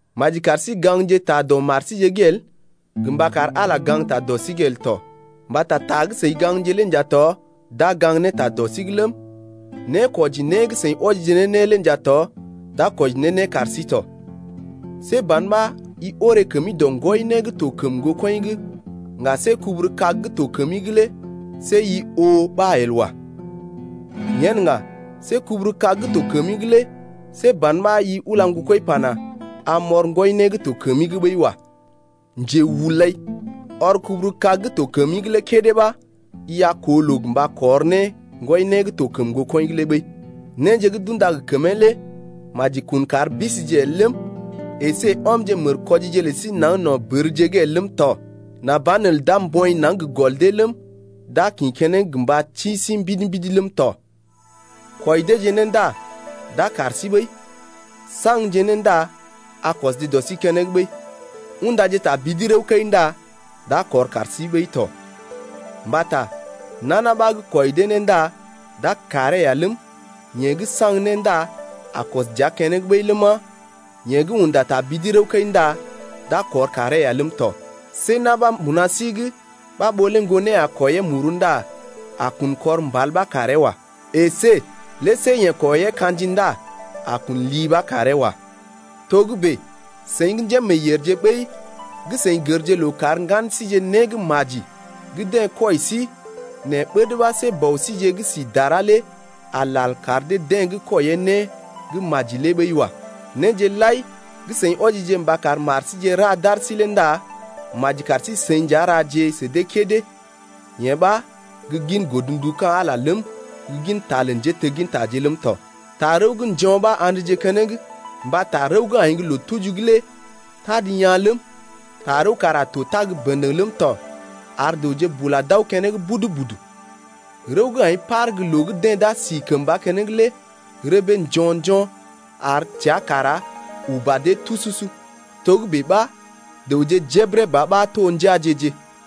Maji kar sí gaŋgje ta dɔ mar síje’g el, gə mba kar Ala gaŋgta dɔ sí’g el tɔ. Mbata ta gə́ seḭ gaŋgje lé nja tɔ d’a gaŋg ne ta dɔ sí’g ləm, nékwɔji né gə́ seḭ wɔjije ne né lé nja tɔ d’a kwɔji ne né kar sí tɔ. See ban ɓa i oré kəmi dɔ ŋgwɔi né gə́ to kəm ŋgokɔḭ’g ŋga see guburu-kag gə́ to kəmi’g lé see i oo ɓa el wa. Yen ŋga see guburu-kag gə́ to kəmi’g lé see ban ɓa i ula ŋgokɔḭ pana: Am m’ɔr ŋgwɔi né gə́ to kəmi’g ɓəi wa. Njehulai, ɔr guburu-kag gə́ to kəmi’g lé kédé ɓa i a koo loo mba kɔr ne ŋgwɔi né gə́ to kəm ŋgokɔḭ’g lé ɓəi. Néje gə́ d’unda gə kəmee lé maji kun kar bisije el ləm, əsé ɔmje mərkwɔjije lə sí naŋg no̰ bərje’g el ləm tɔ, nà banelə d’a mbɔḭ naŋg gə gɔl dee ləm, d’a kḭ keneŋ gə mba ti sí mbidi-mbidi ləm tɔ. Kwɔi deeje né ndá d’a kar sí ɓəi, saŋgje né ndá a kɔsje dɔ sí keneŋ ɓəi, undaje tabidi rəw-kəi ndá d’a kɔr kar sí ɓəi tɔ. Mbata nana ɓa gə́ kwɔi dee né ndá d’a karee ya ləm, yeḛ gə́ saŋg né ndá a kɔs dəa keneŋ ɓəi ləma, yeḛ gə́ unda tabidi rəw-kəi ndá d’a kɔr karee ya ləm tɔ. See na̰ ɓa mbuna sí’g ɓa ɓó lé ŋgonee a kwɔiyee muru ndá a kun kɔr mbal ɓa karee wa. Esé lé see yeḛ kwɔiyee ka̰ji ndá a kun li ɓa karee wa. Togə́bè seḭ gə́ njémeeyèrje ɓəi gə́ seḭ gərje loo kar ŋgan síje né gə́ maji gə́ deḛ kwɔi sí nɛ ɓəd ɓa see Bɔ síje gə́ si dara lé a lal kar deḛ gə́ kwɔiyee né gə́ maji lé ɓəi wa. Néje lai gə́ seḭ wɔjije mba kar mar síje ra d’ar sí lé ndá maji kar sí-seḭ nja raje sə dee kédé, yee ɓa gə́ gin godndu ka̰ Ala lé ləm, gə gin ta lə njéteggintaje ləm tɔ. Tarəw gə́ njo̰ ɓa a̰dje keneŋ. Mbata rəw gə́ aḭ gə́ loo-tuji’g lé tad yaa̰ ləm, tarəw kara to tag bə̰dəŋ ləm tɔ ar dəwje bula d’aw keneŋ budu-budu. Rəw gə́ aḭ par gə́ loo gə́ deḛ d’a si kəmba keneŋ lé rəbee njo̰-njo̰ ar təa kara uba dee tususu. Togə́bè ɓa dəwje jebəre ba ɓa to njeaje-je.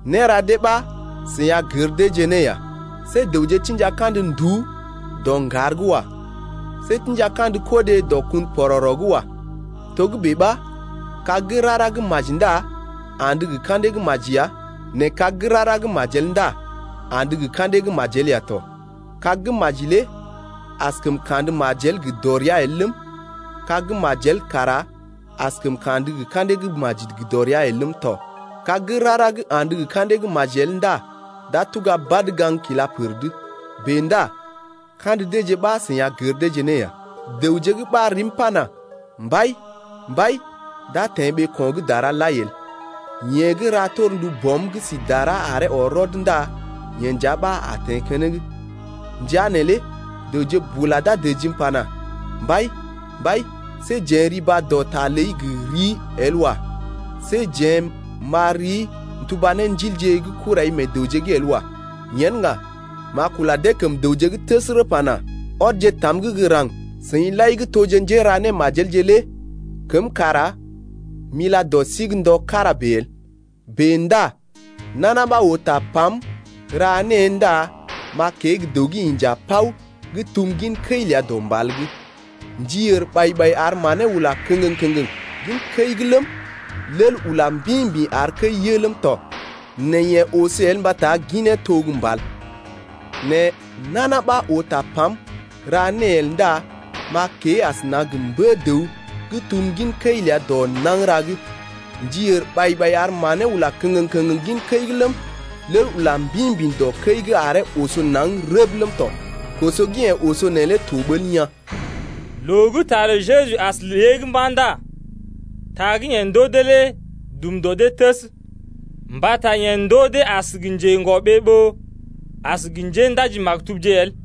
Néra dee ɓa seḭ a gər deeje ne ya. See dəwje tḭja kandə nduú dɔ ŋgar’g wa. See tḭja kandə kodé dɔ kun pɔrɔrɔ’g wa. Togə́bè ɓa kag gə́ rara gə́ maji ndá andə gə ka̰dee gə́ maji ya nɛ kag gə́ rara gə́ majel ndá andə gə ka̰dee gə́ majel ya tɔ. Kag gə́ maji lé askəm kandə majel gə dɔrea el ləm, kag gə́ majel kara askəm kandə gə ka̰dee gə́ maji gə dɔrea el ləm tɔ. Kag gə́ rara gə́ andə gə ka̰dee gə́ maji el ndá d’a tuga badə gaŋg kila pər’d. Bèe ndá kandə deeje ɓa seḭ a gər deeje ne ya. Dəwje gə́ ɓar rim pana: Mbai, Mbai lé d’a teḛ ɓeeko̰ gə́ dara lai el. Nɛ yeḛ gə́ ra torndu Bɔm gə́ sí dara aree ɔr rɔd ndá yeḛ nja ɓa a teḛ keneŋ. Ndəa neelé dəwje bula d’a dəjim pana: Mbai, Mbai, see jeḛ riba dɔ ta ləi gə rii el wa. See jeḛ m’ɓar rii n’tuba ne ndilje gə́ kurai meḛ dəwje’g el wa. Yen ŋga m’a kula dee kəm dəwje’g təsərə pana: Ɔdje tam’g gə́ raŋg, seḭ lai gə́ toje njéra némajelje lé, kəm kara m’ila dɔ sí’g ndɔ kára bèe el. Bèe ndá nana ɓa oo tapam, ra née ndá m’a kée gə́ dəw gə́ inja paw gə́ tum gin kəi ləa dɔ mbal’g. Ndi ər ɓai-ɓai ar manee ula kəŋgəŋ-kəŋgəŋ gin kəi’g ləm, lel ula mbḭ-mbḭ ar kəi yə ləm tɔ, nɛ yee oso el mbata ginee to gə́ mbal. Nɛ nana ɓa oo tapam, ra née el ndá m’a kée asəna gə mbə-dəw gə́ tum gin kəi ləa dɔ nagəra’g. Ndi ər ɓai-ɓai ar manee ula kəŋgəŋ-kəŋgəŋ gin kəi’g ləm, lel ula mbḭ-mbḭ dɔ kəi’g aree oso naŋg rəb ləm tɔ. Koso gə́ yee oso neelé to ɓəl yaa̰. Loo gə́ ta lə Jeju as lée’g mba̰ ndá ta gə́ yeḛ ndoo dee lé dum dɔ dee təs 9mbata yeḛ ndoo dee as gə njedɔmoŋ ɓó as gə njéndaji-maktubje el.